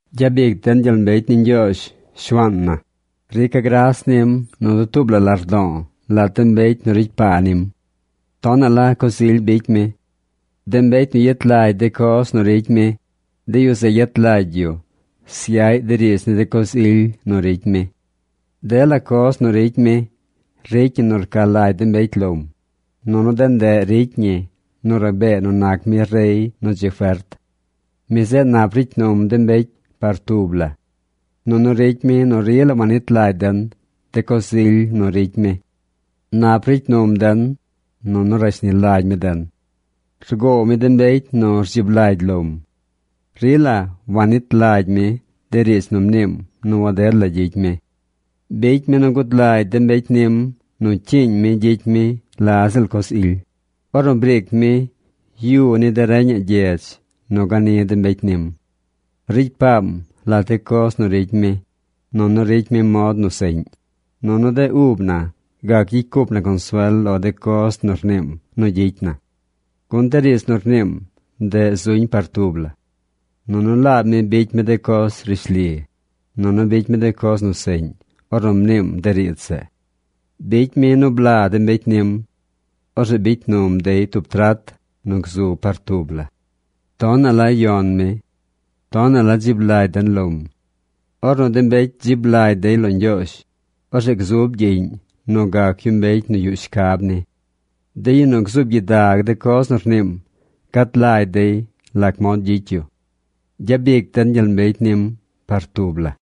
¡Gyabic den gyel mbecy ni Ñgyoozh, Shuaan na! Rica̱ gras nim nu dutuub la lardo̱o̱ lat de mbecy nu ricy paa nim. Tonaꞌ la coz ily bicy mi. De mbecy nu yet lagy de coz nu ricy mi, de yu zeꞌ yet lagy yu syaꞌy de riidz ni de coz ily nu ricy mi. Dela coz nu ricy mi ricy ñi nu rca lagy de mbecy lom, nunu de ndeꞌ ricy ñi nu rabee nu nac mi rey nu dzi fert. Mi zeꞌ nap ricy num de mbecy par tub la. Nunu ricy mi nu rila wanit lagy den de coz ily nu ricy mi. Nap ricy num den, nunu rashni lagy mi den. Rgoow mi de mbecy nu rdzib lagy lom. Rila wannit lagy mi de riidz nu mniim nu waded la gyicy mi. Bicy mi nu gud lagy de mbecy nim nu cyiiñ mi gyicy mi la ziꞌl coz ily, ornu briic mi yu ni de reñaꞌ gyedz nu gani de mbecy nim. Ricy paam lat de coz nu ricy mi, nunu ricy mi mod nu seꞌñ, nunu de ub na gac gyicy cup na consuel lo de coz nu rniim nu gyicy na. Gun de riidz nu rniim ndeꞌ zuñ par tub la. Nunu laab mi bicy mi de coz rishli, nunu bicy mi de coz nu seꞌñ ornu mniim de riidz zeꞌ. Bicy mi nu bla de mbecy nim. Orzeꞌ bicy num dey tub trat nu gzu par tub la. Tonaꞌ la nu yon mi. Tonaꞌ la dzib lagy den lom. Ornu de mbecy dzib lagy dey lo Ñgyoozh, orzeꞌ gzub gyiꞌñ nu gac yu mbecy nu yuꞌ shcab ni. De yu nu gzuub gyidag de coz nu rniim gad lagy dey lac mod gyicy yu. Gyabic den gyel mbecy nim par tub la.